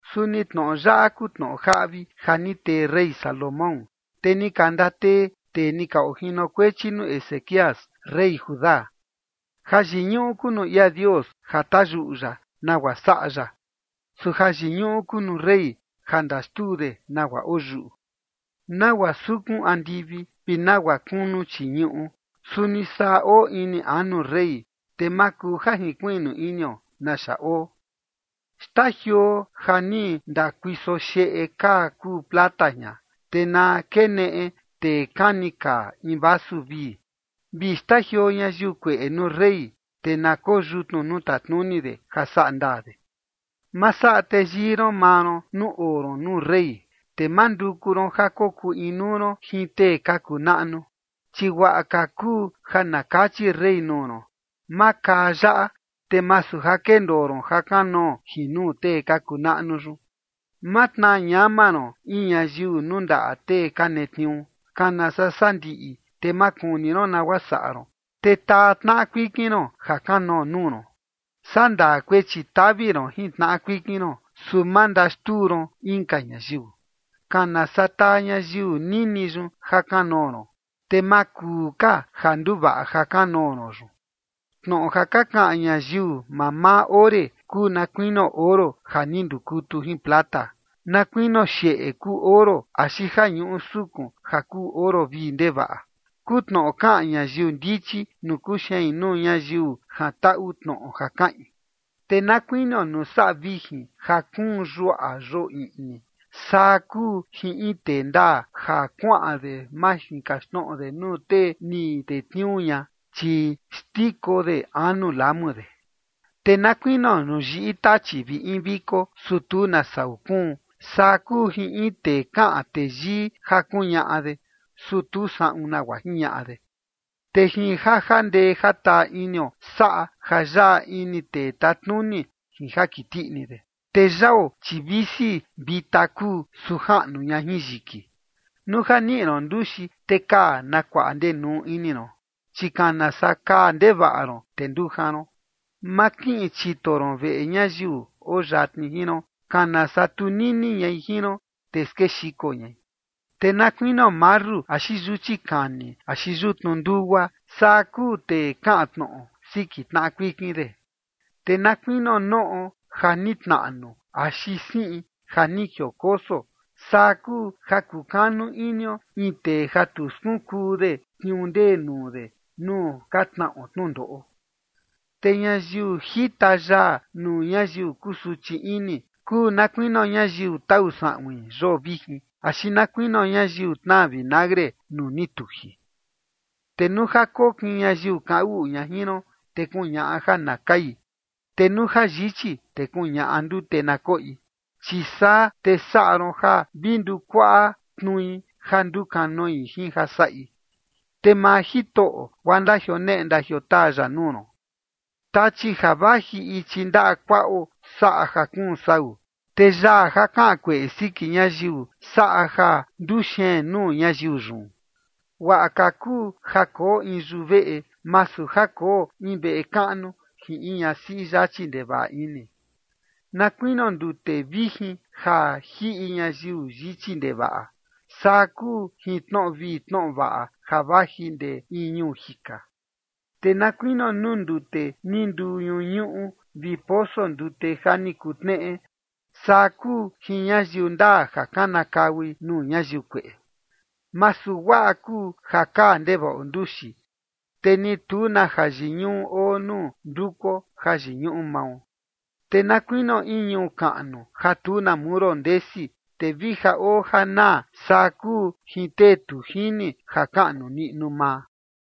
Suni tnoꞌo yaꞌa kuu tnoꞌo jaꞌvi ja ni tee rey Salomón, te ni ka ndatee tee ni ka ojinokuechi nuu Ezequías, rey Judá. Jayiñuꞌu kuu nuu ia Dios ja tayuꞌu ya nagua saꞌa ya. Su jayiñuꞌu kuu nuu rey ja ndaxtuu de nagua oo yuꞌu. Nagua sukun andivi vi nagua kunu chii ñuꞌu, suni saa oo ini anu rey, te ma kuu ja jinkuiꞌnu inio naxa oo. Xtajioo ja ni ndakuiso xeꞌe kaa kuu plata jian, te na keneꞌe tee kani kaa in vasu vii. Vi xtajioo ñayiu kueꞌe nuu rey, te na koo yutnu nuu tatnuni de ja saꞌa ndaa de. Ma saꞌa teyii ron maa ron nuu oo ron nuu rey, te ma nduku ron ja kokuu inuu ron jin tee ka kuu naꞌnu. Chi guaꞌa ka kuu ja na kachi rey nuu ron: “Makaa yaꞌa”, te masu ja kendoo ron jakanoo jin nuu tee ka kuu naꞌnu yun. Ma tnaa ñama ron in ñayiu nuu ndaꞌa tee ka netniuu, kana saa sandiꞌi, te ma kuni ron nagua saꞌa ron, te taa tnaꞌa kuikin ron jakanoo nuu ron. Sandaa kuechi tavi ron jin tnaꞌa kuikin ron, su ma ndaxtuu ron inka ñayiu. Kana saa taa ñayiu nini yun jakanoo ron, te ma kuu ka ja nduvaꞌa jakanoo ron yun. Tnoꞌo ja ka kaꞌan ñayiu mamaa ore kuu na kuinio oro ja ni ndukutu jin plata. Na kuinio xeꞌe kuu oro axi ja ñuꞌu sukun ja kuu oro vii ndevaꞌa, kuu tnoꞌo kaꞌan ñayiu ndichi nuu kuxein nuu ñayiu jantaꞌu tnoꞌo ja kaꞌin. Te na kuinio nuu saꞌa vijin ja kuun yuaꞌa yoo iꞌni, saa kuu jin in tee ndaa ja kuaꞌan de majinkaxtnoꞌo de nuu tee ni tetniuu ña, chi xndiko de anu lamu de. Te na kuinio nuu yiꞌi tachi vi in viko, su tu na sau kuun, saa kuu jin in tee kaꞌan teyii ja kuñaꞌa de, su tu saꞌun nagua jiñaꞌa de. Te jin ja jandee jataa inio saꞌa ja yaꞌa ini tee tatnuni jin ja kiti ini de, te yao, chi visi vita kuu, su jaꞌnu ña jin yiki. Nuu ja niꞌi ron nduxi, te kaa na kuaꞌa ndenuu ini ron, chi kana saa kaa ndevaꞌa ron, te ndujan ron. Ma kiꞌin chito ron veꞌe ñayiu oo yatni jin ron, kana saa tunini ñai jin ron, te skexiko ñai. Te na kuinio marru axi yuchi kani axi yutnu ndugua, saa kuu tee kaꞌan tnoꞌo siki tnaꞌa kuikin de. Te na kuinio noꞌo ja ni tnaꞌnu axi siꞌi ja ni jiokoso, saa kuu ja kukanu inio in tee ja tu skunkuu de tniuu ndee nuu de nuu ka tnaꞌo tnundoꞌo. Te ñayiu jita yaa nuu ñayiu kusuchi ini, kuu na kuinio ñayiu tau saꞌuin yoo vijin axi na kuinio ñayiu tnaa vinagre nuu ni tuji. Te nuu ja kokin ñayiu kaꞌan uꞌu ña jin ron, te kuñaꞌa ja na kai, te nuu ja yichi, te kuñaꞌa ndute na koꞌi. Chi saa te saꞌa ron ja vi ndukuaꞌa tnui ja ndukanoi jin ja saꞌi, te maa Jitoꞌo, guaa ndandioneꞌe ndandiotaa ya nuu ron. Tachi ja vaji ichi ndaꞌa kuaꞌo saꞌa ja kuun sau, te yaa ja kaꞌan kueꞌe siki ñayiu saꞌa ja nduxeen nuu ñayiu yun. Guaꞌa ka kuu ja koo in yuveꞌe, masu ja koo in veꞌe kaꞌnu jin in ñasiꞌi yachi ndevaꞌa ini. Na kuinio ndute vijin ja jiꞌi ñayiu yichi ndevaꞌa, saa kuu jin tnoꞌo vii tnoꞌo vaꞌa ja vaji ndee in ñuu jika. Te na kuinio nuu ndute ni nduu ñuñuꞌu, vi poso ndute ja ni kutneꞌe, saa kuu jin ñayiu ndaa ja kanakaui nuu ñayiu kueꞌe. Masu guaꞌa kuu ja kaa ndevaꞌo nduxi, te ni tu na jayiñuꞌu oo nuu ndukuo jayiñuꞌu mao. Te na kuinio in ñuu kaꞌnu ja tu na muro ndesi, te vi ja oo ja naa, saa kuu jin tee tu jini ja kaꞌnu niꞌnu maa.